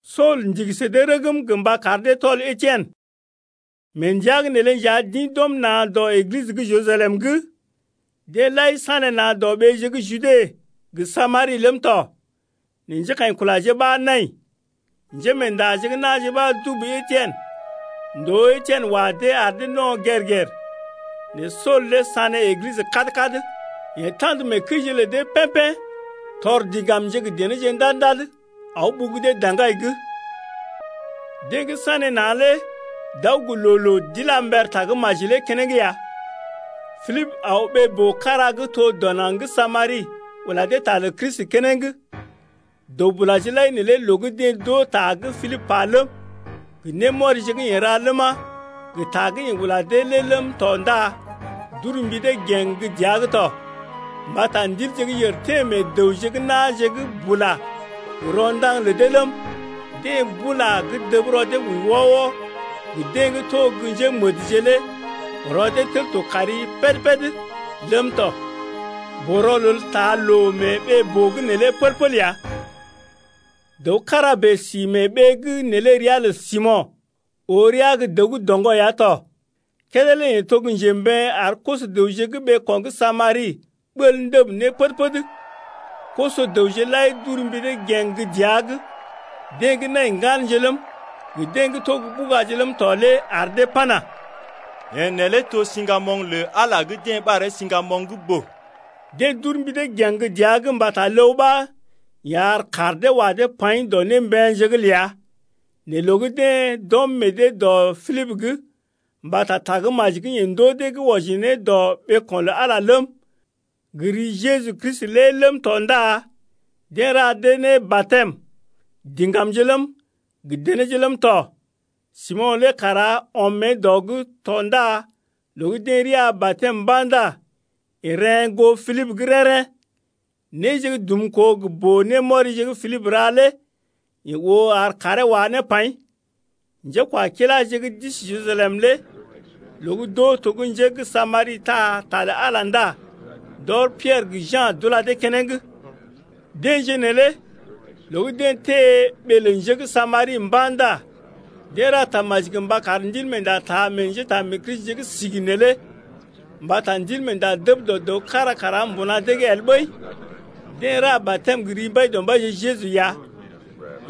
Sool ndigi sə dee rəgm gə mba kar dee tɔl Etien. Sool ula kəm églisə ndòo Mee ndəa’g neelé nja d’ḭ d’ɔm na̰ dɔ Eglisə gə́ Jerusalem’g. Deḛ lai sanéna̰ dɔ ɓeeje gə́ Jude gə Samari ləm tɔ, nɛ njékaḭkulaje ɓa nai. Njémeendaje gə́ na̰je ɓa dubu Etien. Ndoo Etien wa dee ar dee no̰ gèr-gèr ya. Nɛ Sool lé sané Eglisə kad-kad. Yeḛ ta̰d mee kəije lə dee pḛ́-pḛ́ tɔr diŋgamje gə denéje ndad-ndad, aw ɓugu dee daŋgai’g. Deḛ gə́ sanéna̰ lé d’aw gə loo-loo d’ila mber tagə́maji lé keneŋ ya. Pilibə aw ɓee-boo kára gə́ to dɔ naŋg gə́ Samari ula dee ta lə Kristi keneŋ. Dəw-bulaje lai neelé loo gə́ deḛ d’oo ta gə́ Pilibə pa ləm, gə némɔrije gə́ yeḛ ra ləma, gə ta gə́ yeḛ ula dee lé ləm tɔ ndá d’uru mbi dee gèŋ gə́ dəa’g tɔ. Mbata ndilje gə́ yèr teḛ meḛ dəwje gə́ na̰je’g bula gə ro̰daŋ lə dee ləm, deḛ bula gə́ dəb rɔ dee wəi wɔ-wɔ gə deḛ gə́ to gə́ njémədje lé rɔ dee tel to kari péd-péd ləm tɔ. Boo-rɔlel taa loo mee ɓee-boo’g neelé pəl-pəl ya. Dəw kára bèe si mee ɓee gə́ neelé ria lə Simo̰ oo rəa gə́ dəw gə́ doŋgɔ ya tɔ, kédé lé yeḛ to gə́ njembeḛ ar koso-dəwje gə́ ɓeeko̰ gə́ Samari ɓəlee ndəb ne pəd-pəd. Koso-dəwje lai d’ur mbi dee gèŋ gə́ dəa’g, deḛ gə́ nai ŋganje ləm, gə deḛ gə́ to gə́ ɓugaje ləm tɔ lé ar dee pana: Yeḛ neelé to gə́ siŋgamoŋ lə Ala gə́ deḛ ɓaree siŋgamoŋ gə́ boo lé. Deḛ d’ur mbi dee gèŋ gə́ dəa’g mbata ləw ɓa yeḛ ar kaar dee wa dee paḭ dɔ némbeḛje’g ləa. Nɛ loo gə́ deḛ d’ɔm meḛ dee dɔ Pilibə’g mbata tagə́maji gə́ yeḛ ndoo dee gə́ wɔji ne dɔ ɓeeko̰ lə Ala ləm, gə ri Jeju Kristi lé ləm tɔ ndá deḛ ra dee ne batɛm, diŋgamje ləm, gə denéje ləm tɔ. Simo̰ lé kara ɔm mée dɔ’g tɔ ndá loo gə́ deḛ rəa batɛm mba̰ ndá yeḛ reḛ́ goo Pilibə’g rḛ́-rḛ́. Néje gə́ dumkoo gə boo-némɔrije gə́ Pilibə ra lé yeḛ oo ar kaaree wá ne paḭ. Njékwakiláje gə́ d’isi Jerusalem lé loo gə́ d’oo to gə́ njé gə́ Samari taa ta lə Ala lé ndá d’ɔr Piɛrə gə Ja̰ d’ula dee keneŋ. Deḛje neelé loo gə́ deḛ teḛ ɓee lə njé gə́ Samari mba̰ ndá deḛ ra tamaji gə mba kar Ndilmeenda taa meḛ njétaamee-Kristije gə́ sigi neelé. Mbata Ndilmeenda dəb dɔ dəw kára kara mbuna dee’g el ɓəi, deḛ ra batɛm gə ri Mbaidɔmbaije Jeju ya.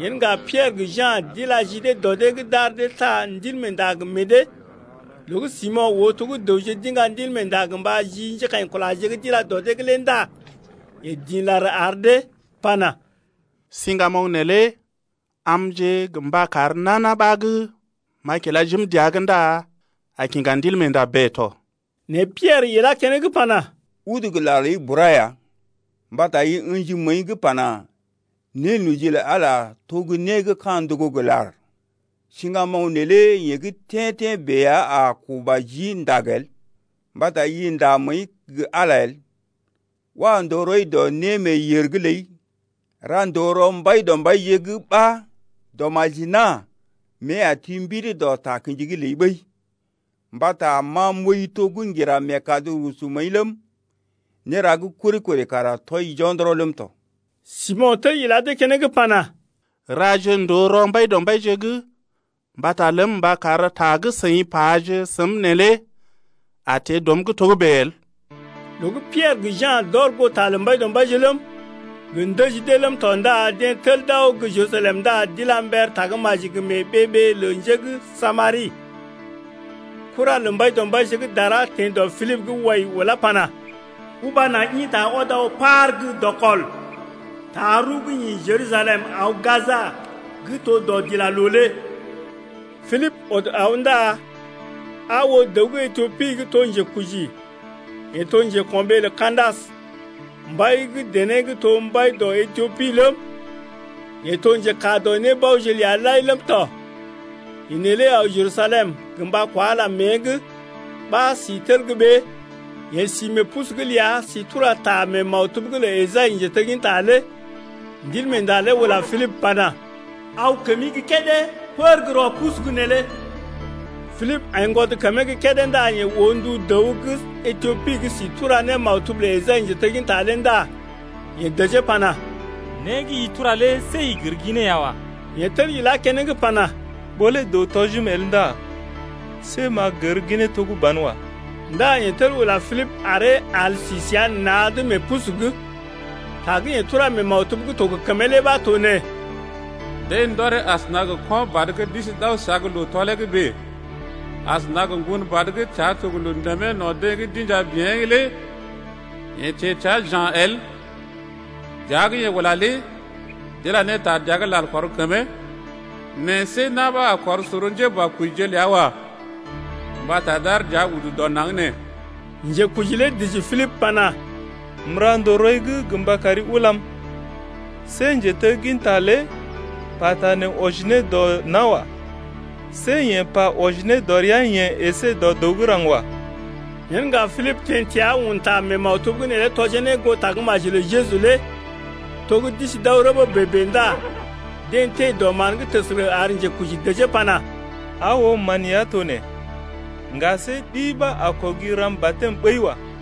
Yen ŋga Piɛrə gə Ja̰ d’ila ji dee dɔ dee’g d’ar dee taa Ndilmeenda gə meḛ dee. Loo gə́ Simo̰ oo to gə́ dəwje d’iŋga Ndilmeenda gə mba ji njékaḭkulaje gə́ d’ila dɔ dee’g lé ndá yeḛ dḭ lar ar dee pana: Siŋgamoŋ neelé amje gə mba kar nana ɓa gə́ m’a kila jim dəa’g ndá a kiŋga Ndilmeenda bèe tɔ. Nɛ Piɛrə ilá keneŋ pana: Udu gə lar ləi bura ya, mbata i ə̰ji məəi’g pana: Nénoji lə Ala lé to gə́ né gə́ ka̰ ndogo gə lar. Siŋgamoŋ neelé yeḛ gə́ tḛ́-tḛ́ bèe ya a kuba jii ndag el, mbata i nda məəi gə Ala el. Wa ndòo rɔi dɔ némeeyèr’g ləi, ra ndòo rɔ Mbaidɔmbaije’g ɓa dɔmaji-nà mée a ti mbidi dɔ takə̰ji’g ləi ɓəi, mbata ma m’ooi to gə́ ŋgira meekad rusu məəi ləm, néra gə́ kori-kori kara tɔi jo̰dɔrɔ ləm tɔ. Simo̰ tel ila dee keneŋ pana: Raje ndòo rɔ Mbaidɔmbaije’g mbata ləm mba kar ta gə́ seḭ paje səm neelé a teḛ dɔm’g togə́bè el. Loo gə́ Piɛrə gə Ja̰ d’ɔr goo ta lə Mbaidɔmbaije ləm, gə ndəji dee ləm tɔ ndá deḛ tel d’aw gə́ Jerusalem ndá d’ila mber tagə́maji gə mee ɓee-ɓee lə njé gə́ Samari. Kura lə Mbaidɔmbaije gə́ dara teḛ dɔ Pilibə’g wai ulá pana: Uba naŋg ḭta ɔd aw par gə́ dɔkɔl, taa rəw gə́ ḭ Jerusalem aw Gaja gə́ to dɔdilaloo lé. Pilibə ɔd aw ndá aa oo dəw gə́ Etiopi gə́ to njekuji yeḛ to njeko̰ɓee lə Ka̰dasə, mbai gə́ dené gə́ to mbai dɔ Etiopi ləm, yeḛ to njekaa dɔ nébaoje ləa lai ləm tɔ. Yeḛ neelé aw Jerusalem gə mba kwa Ala mée’g ɓa si tel gə́ ɓée. Yeḛ si mee pusu’g ləa si tura ta mee maktub’g lə Esai njetegginta lé. Ndilmeenda lé ula Pilibə pana: Aw kəmi gə́ kédé pər gə́ rɔ pusu’g neelé. Pilibə aiŋgwɔd kəmee gə́ kédé ndá yeḛ oo ndu dəw gə́ Etiopi gə́ si tura ne maktub lə Esai njetegginta lé ndá yeḛ dəjee pana: Né gə́ i tura lé see i gər ginee ya wa. Yeḛ tel ilá keneŋ pana: Ɓó lé dəw tɔjim el ndá see m’a gər ginee to gə́ banwa. Ndá yeḛ tel ula Pilibə aree al si səa na̰’d mee pusu’g lé. Ta gə́ yeḛ tura mee maktub gə́ to gə kəmee lé ɓa to nee: Deḛ ndɔree asəna gə ko̰ badə gə́ d’isi d’aw səa gə́ loo tɔlee’g bèe, Asəna gə ŋgon badə gə́ təa to gə loo ndèmee no̰ deḛ gə́ d’inja bḭyee lé Yeḛ teḛ təa ja̰ el. Dəa gə́ yeḛ ula lé d’ila ne ta dəa’g lal kɔr kəmee. Nɛ see na̰ ɓa a kɔr sor njéboakojije ləa wa. Mbata d’aar dəa udu dɔ naŋg nee. Njekuji lé dəji Pilibə pana: M’ra ndòo rɔi’g gə mba kari ulam see njetegginta lé pata nee wɔji ne dɔ nawa. See yeḛ pa wɔji ne dɔ rəa-yeḛ əsé dɔ dəw gə́ raŋg wa. Yen ŋga Pilibə teḛ təa un ta mee maktub’g neelé tɔjee ne goo tagə́maji lə Jeju lé. To gə́ d’isi d’aw rəbee bèe-bèe ndá deḛ teḛ dɔ mán’g təsərə ar njekuji dəjee pana: Aa oo mán ya to nee, ŋga see ɗi ɓa a kɔgi ram batɛm ɓəi wa.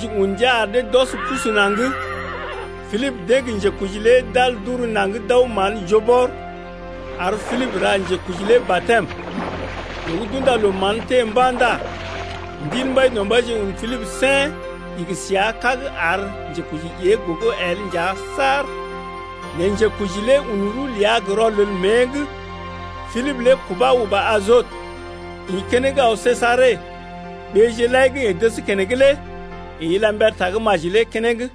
Njekuji un ndia ar dee d’ɔs pusu naŋg, Pilibə deḛ gə njekuji lé d’al d’uru naŋg d’aw mán joo bɔr, ar Pilibə ra njekuji lé batɛm. Loo gə́ d’unda loo mán teḛ mba̰ ndá Ndil Mbaidɔmbaije un Pilibə sèn, igi səa kág ar njekuji ée gogo el nja saar. Nɛ njekuji lé un rəw ləa gə rɔlel mée’g. Pilibə lé kubà ndá uba Ajot, ḭ keneŋ aw Sejare. Ɓeeje lai gə́ yeḛ dəs keneŋ lé yeḛ ila mber tagə́maji lé keneŋ.